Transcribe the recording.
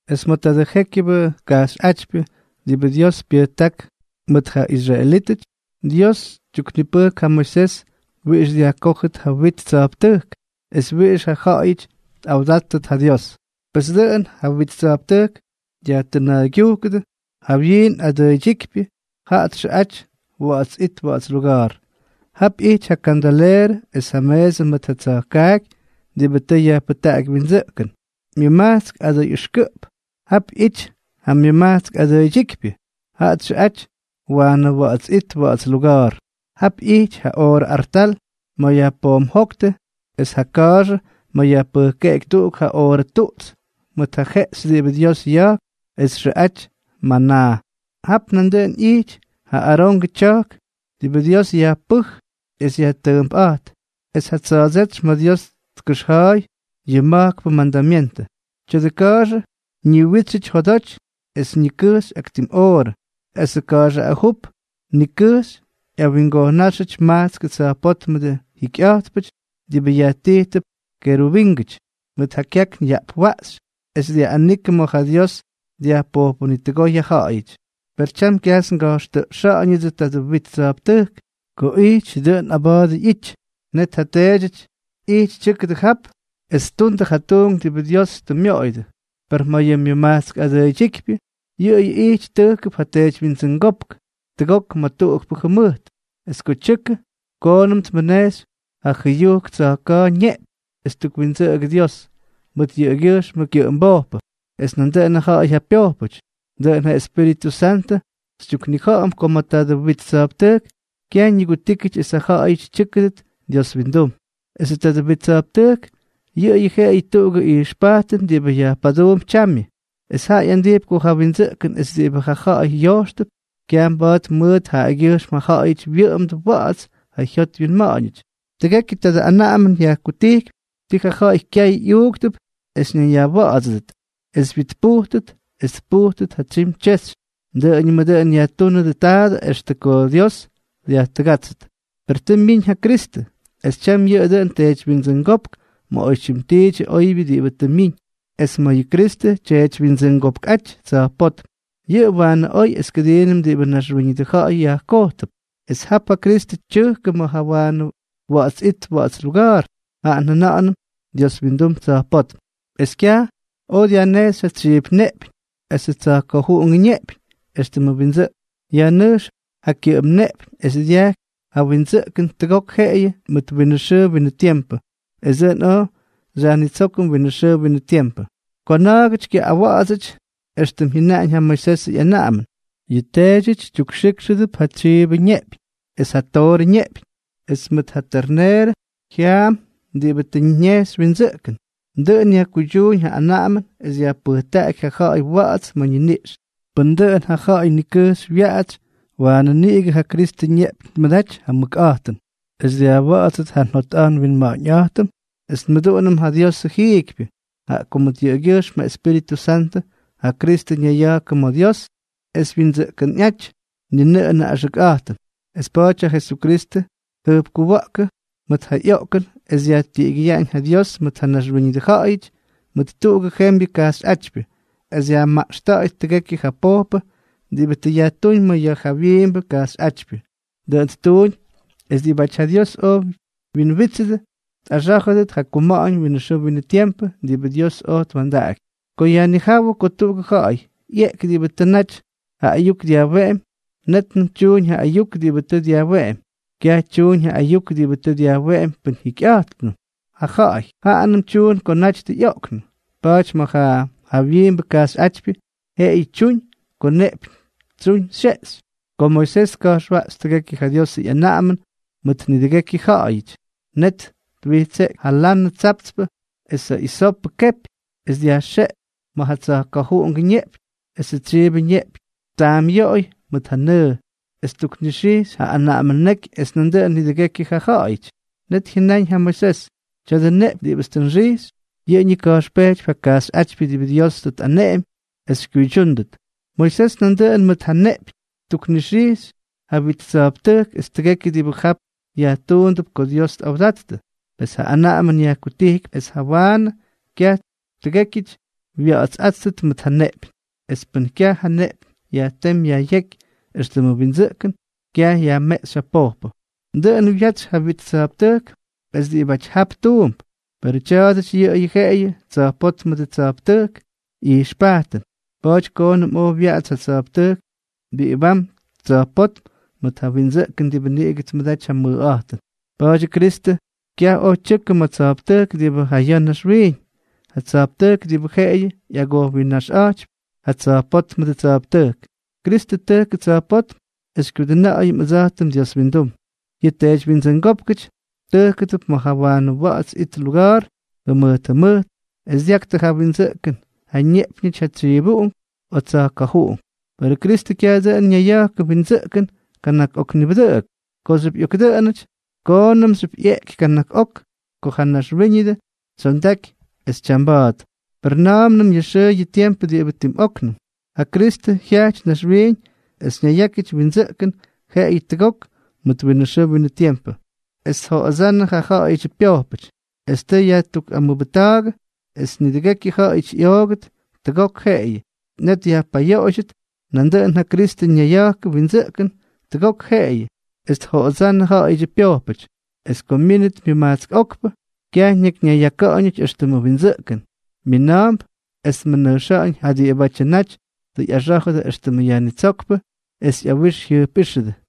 Es ma̱ tadʉ jékyʉbʉ kajxyꞌátypyʉ diꞌibʉ Dios pyʉjták mʉt ja israelítʉty, Dios tyuknipʉjk ja Moisés wiꞌix dyajkójʉt ja wit tsa̱jptʉjk es wiꞌix ja ja̱ꞌa̱yʉty tꞌawdáttʉt ja Dios. Pes, dʉꞌʉn ja wit tsa̱jptʉjk dyajtʉna̱a̱ydyujkʉdʉ: Ja jawyiin adʉʉydyíkypyʉ jaꞌa txʉꞌa̱jty Wa̱ꞌa̱ts It Wa̱ꞌa̱ts Luga̱a̱r. Jap ꞌyijty ja kandaleerʉ es ja meesʉ mʉt ja tsa̱jkaaky diꞌibʉ tʉ yajpʉjtaꞌaky windsʉꞌkʉn. Myʉmajtsk adʉy ʉxkʉꞌp, jap ꞌyijty ja myʉmajtsk adʉʉydyíkypyʉ. Jaꞌa txʉꞌa̱jty Waanʉ Wa̱ꞌa̱ts It Wa̱ꞌa̱ts Luga̱a̱r. Jap ꞌyijty ja oorʉ artal ma̱ yajpoomjóktʉ, es ja ka̱a̱xʉ ma̱ yajpʉjkeꞌky tuꞌugʉ oorʉ tuꞌts mʉt ja jeꞌxy diꞌibʉ Dios ya̱jk es txʉꞌaty manaa. Jap nandʉꞌʉn ꞌyijty ja Arongʉ tya̱jk diꞌibʉ Dios yajpʉj es yajtʉʉmpꞌa̱jt, es ja tsa̱a̱dsétsy ma̱ Dios tkʉxja̱a̱y yʉ ma̱jkpʉ mandamyentʉ. Tya̱dʉ ka̱a̱xʉ ñiwítsyʉty jodoty es nikʉjxy ak tim oorʉ, es ka̱a̱xʉ ajup nikʉjxy ꞌyawingojnáxyʉty majtskʉ tsa̱jpótmʉdʉ jikyꞌa̱jtpʉty diꞌibʉ yajtijtʉp kerubíngʉty, mʉt ja kyakn yaꞌpwaꞌxy es dyaꞌꞌanikʉ ma̱ ja Dios dyajpojpʉnitʉgooy ja ja̱ꞌa̱yʉty. Per tyam kyajts nga̱jxtʉꞌxa̱ꞌa̱ñʉdsʉ tadʉ wit tsa̱jptʉjk. Ko ijty dʉꞌʉn aba̱a̱dʉ ꞌyity, net ja teedyʉty ijty tyʉ́kʉdʉ jap es ttundʉ ja tuunk diꞌibʉ Dios tʉ myoꞌoyʉdʉ. Per ma̱ yʉ myʉmajtsk adʉʉydyíkypyʉ, yʉꞌʉyʉ ijty tʉjkʉp ja teedywyindsʉngópk tʉgok ma̱ tuꞌukpʉ jʉmʉjt; es ko tyʉkʉ, koonʉm tmʉnejxy ja jʉyujk tsa̱jka̱a̱jʉ ñeꞌpyñ es ttukwindsʉꞌʉgʉ Dios mʉt yʉꞌʉgyʉjxmʉ kyʉꞌʉmbojpʉ es nandʉꞌʉn ja ja̱ꞌa̱y ja pyojpʉty. Dʉꞌʉn ja Espíritʉ Santʉ xytyuknija̱ꞌa̱m ko ma̱ tadʉ wit tsa̱jptʉjk, kyaj ñigutíkyʉty esʉ ja̱ꞌa̱yʉty tyʉ́kʉdʉt Dios windum. Esʉ tadʉ wit tsa̱jptʉjk yʉꞌʉyʉ jeꞌeyʉ tuꞌugʉ ijxpajtʉn diꞌibʉ yajpaduump tyamyʉ, es jaꞌa ꞌyandijpy ko ja windsʉꞌkʉn es diꞌibʉ ja ja̱ꞌa̱y yojxtʉp, kyaj mba̱a̱t mʉt jaꞌagyʉjxm ja ja̱ꞌa̱yʉty wyʉꞌʉmdʉ wa̱ꞌa̱ts ja jyot wyinma̱ꞌa̱ñʉty. Tʉgekyʉ tadʉ anaꞌamʉn yajkutijkypy ti ja ja̱ꞌa̱y kyay ꞌyuuktʉp es ñayyajwa̱ꞌa̱dsʉdʉt, es wyitpujtʉt, es tpujtʉt ja tsyim tyexy. Dʉꞌʉñʉmʉ dʉꞌʉn yajtúnʉdʉ taadʉ extʉ ko Dios dyajtʉgátsʉt. Per tʉ myiñ ja Kristʉ, es tyam yʉꞌʉ dʉꞌʉn teedywyindsʉngópk ma̱ oytyim tiidyʉ oybyʉ diꞌibʉ tʉ myiñ; es ma̱ yʉ Kristʉ tyeedywyindsʉngopkꞌáty tsa̱jpótm, yʉꞌʉ waanʉ oy es kʉdiinʉm diꞌibʉ naxwíñʉdʉ ja̱ꞌa̱y yajkojtʉp. Es jap ja Kristʉ tyʉjkʉ ma̱ ja Waanʉ Wa̱ꞌa̱ts It Wa̱ꞌa̱ts Luga̱a̱r, jaꞌa njʉna̱ꞌa̱nʉm Dios wyindum tsa̱jpótm, es kyaj oj dyajnejxy ja tsyiip ñeꞌpyñ esʉ tsa̱jka̱juꞌungʉ ñeꞌpyñ éxtʉmʉ windsʉꞌkʉn; yajnʉjx ja kyʉꞌʉm neꞌpyñ es dyajky ja windsʉꞌkʉn tʉgok jeꞌeyʉ mʉt winʉ xʉʉ winʉ tiempʉ, es dʉꞌʉn oj xyajnitsókʉm winʉ xʉʉ winʉ tiempʉ. Ko na̱a̱gʉty kyawa̱ꞌa̱dsʉty éxtʉm jyʉnaꞌañ ja Moisesʉ ꞌyanaꞌamʉn, yʉ teedyʉty tyukxijkxʉdʉp ja tsyiibʉ ñeꞌpyñ es ja toorʉ ñeꞌpyñ, es mʉt ja terneerʉ jya̱a̱m diꞌibʉ tʉ ñejxy windsʉꞌkʉn. Dʉꞌʉn yajkuydyuuñ ja anaꞌamʉn es yajpʉjtaꞌaky ja ja̱ꞌa̱y wa̱ꞌa̱ts ma̱ ñiniꞌx. Pʉn dʉꞌʉn ja ja̱ꞌa̱y nikʉjxy wyaꞌatsy, waanʉ niꞌigʉ ja Kristʉ ñeꞌpyñ tmʉdaty ja mʉkꞌa̱jtʉn es dyajwa̱ꞌa̱dsʉt ja njot nwinma̱ꞌa̱ñꞌa̱jtʉm es nmʉduꞌunʉm ja Diosʉ jiikypyʉ, jaꞌa ko mʉt yʉꞌʉgyʉjxm ja Espíritʉ Santʉ ja Kristʉ ñayya̱jkʉ ma̱ Dios es wyindsʉꞌkʉnꞌáty, ni nʉꞌʉnʉ axʉkꞌa̱jtʉn. Es pa̱a̱ty ja Jesukristʉ tjʉjpkuwa̱ꞌkʉ mʉt ja ꞌyoꞌkʉn es dyajtiꞌigyʉyaꞌañ ja Dios mʉt ja naxwíñʉdʉ ja̱ꞌa̱yʉty mʉt tuꞌugʉ jembyʉ kajxyꞌátypyʉ, es yajmaꞌxta̱ꞌa̱yʉt tʉgekyʉ ja pojpʉ diꞌibʉ tʉ yajtúñ ma̱ ja jawyiimbʉ kajxyꞌátypyʉ. Dʉꞌʉn ttuuñ es diꞌibáty ja Dios oj wyinwítsʉdʉ, tꞌaxá̱jʉdʉt ja kuma̱ꞌa̱ñ winʉ xʉʉ winʉ tiempʉ diꞌibʉ Dios oj twa̱ndaꞌaky. Ko yajnijáwʉ ko tuꞌugʉ ja̱ꞌa̱y ꞌyeeky diꞌibʉ tʉ naty ja ayuk dyajweꞌemy, nétnʉm tyuñ ja ayuk diꞌibʉ tʉ dyajweꞌemy. Kyaj tyuñ ja ayuk diꞌibʉ tʉ dyajweꞌemy pʉn jikyꞌa̱jtpnʉm ja ja̱ꞌa̱y, jaanʉm tyuñ ko naty tʉ ꞌyoꞌknʉ. Pa̱a̱ty ma̱ ja jawyiimbʉ kajxyꞌátypyʉ, jeꞌeyʉ tyuñ ko neꞌpyñ tsyuñ xyeꞌxy. Ko Moisés tka̱jxwaꞌxy tʉgekyʉ ja Diosʉ ꞌyanaꞌamʉn ma̱ nidʉgekyʉ ja̱ꞌa̱yʉty, net twijtseꞌky ja lanʉ tsaptspʉ es ja isopʉ kepy, es dyajxeꞌky ma̱ ja tsa̱jka̱juꞌungʉ ñeꞌpyñ esʉ tsyiibʉ ñeꞌpyñ ttaamꞌyoꞌoy mʉt ja nʉʉ, es ttuknixijkxy ja anaꞌamʉn neky es nandʉꞌʉn nidʉgekyʉ ja ja̱ꞌa̱yʉty. Net jyʉnáñ ja Moisés: “Tya̱dʉ neꞌpyñ diꞌibʉts tʉ nxijkxy, yʉꞌʉ ñika̱jxpejtypy ja kajxyꞌátypyʉ diꞌibʉ Dios tʉ tꞌaneꞌemy es xykyuydyúndʉt.” Moisés nandʉꞌʉn mʉt ja neꞌpyñ ttukxijkxy ja wit tsa̱jptʉjk es tʉgekyʉ diꞌibʉ jap yajtuundʉp ko Dios tꞌawdattʉ. Pes ja anaꞌamʉn yajkutijkypy es jawaanʉ kyaj tʉgékyʉty wya̱ꞌa̱tsꞌáttʉt mʉt ja neꞌpyñ. Es pʉn kyaj ja neꞌpyñ yajtémy yajꞌyéky éxtʉmʉ windsʉꞌkʉn, kyaj yajmeꞌxy ja pojpʉ. Dʉꞌʉn wyatsy ja wit tsa̱jptʉjk es diꞌibáty jap tuump. Perʉ tya̱a̱dʉty yʉꞌʉyʉ jeꞌeyʉ tsa̱jpótmʉdʉ tsa̱jptʉjkʉ ꞌyijxpajtʉn. Pa̱a̱ty koonʉm oj wyaꞌatsy ja tsa̱jptʉjk diꞌibam tsa̱jpótm mʉt ja windsʉꞌkʉn diꞌibʉ niꞌigʉ tmʉdaty ja mʉjꞌa̱jtʉn. Pa̱a̱dyʉ Kristʉ kyaj oj tyʉkʉ ma̱ tsa̱jptʉjk diꞌibʉ ja ya̱ naxwiiñ, ja tsa̱jptʉjk diꞌibʉ jeꞌeyʉ ꞌyagojwinna̱jxꞌa̱jtypy ja tsa̱jpótmʉdʉ tsa̱jptʉjk. Kristʉ tʉjkʉ tsa̱jpótm es xykyudʉna̱ꞌa̱yʉm ʉdsa̱jtʉm Dios windum. Yʉ teedywyindsʉngópkʉty tʉjkʉdʉp ma̱ ja Waanʉ Wa̱ꞌa̱ts It Wa̱ꞌa̱ts Luga̱a̱r jʉmʉjt jʉmʉjt es dyaktʉ ja windsʉꞌkʉn ja ñeꞌpyñʉty ja tsyiivuꞌunk o tsa̱jka̱juꞌunk. Perʉ Kristʉ kyaj dʉꞌʉn ñayya̱jkʉ windsʉꞌkʉn kana̱k ok nibʉdʉꞌʉk. Kooxyʉp ꞌyokdʉꞌʉnʉty, koonʉmxyʉp ꞌyeꞌky kana̱k ok ko ja naxwíñʉdʉ tsyondaky es tyamba̱a̱t. Per na̱a̱mnʉm yʉ xʉʉ yʉ tiempʉ diꞌibʉ tim óknʉm, ja Kristʉ jyaꞌty naxwiiñ es ñayyákyʉty windsʉꞌkʉn jeꞌeyʉ tʉgok mʉt winʉ xʉʉ winʉ tiempʉ, es tjoꞌodsánnʉ ja ja̱ꞌa̱yʉdyʉ pyojpʉty. Extʉm tʉ yajtukꞌamʉbʉjta̱a̱gʉ es nidʉgekyʉ ja̱ꞌa̱yʉty ꞌyoogʉt tʉgok jeꞌeyʉ, net yajpayoꞌoydyʉt, nandʉꞌʉn ja Kristʉ ñayya̱jkʉ windsʉꞌkʉn tʉgok jeꞌeyʉ es tjoꞌodsánnʉ ja ja̱ꞌa̱yʉdyʉ pyojpʉty. Es ko myínʉt myʉmajtsk okpʉ, kyaj ñakyñayyaka̱ꞌa̱ñʉty éxtʉmʉ windsʉꞌkʉn, mina̱a̱mp es tmʉnʉjxa̱ꞌa̱ñ ja diꞌibátyʉ naty tʉ ꞌyaxá̱jʉdʉ éxtʉmʉ Yajnitsókpʉ es ꞌyawix jyʉjpꞌíxʉdʉ.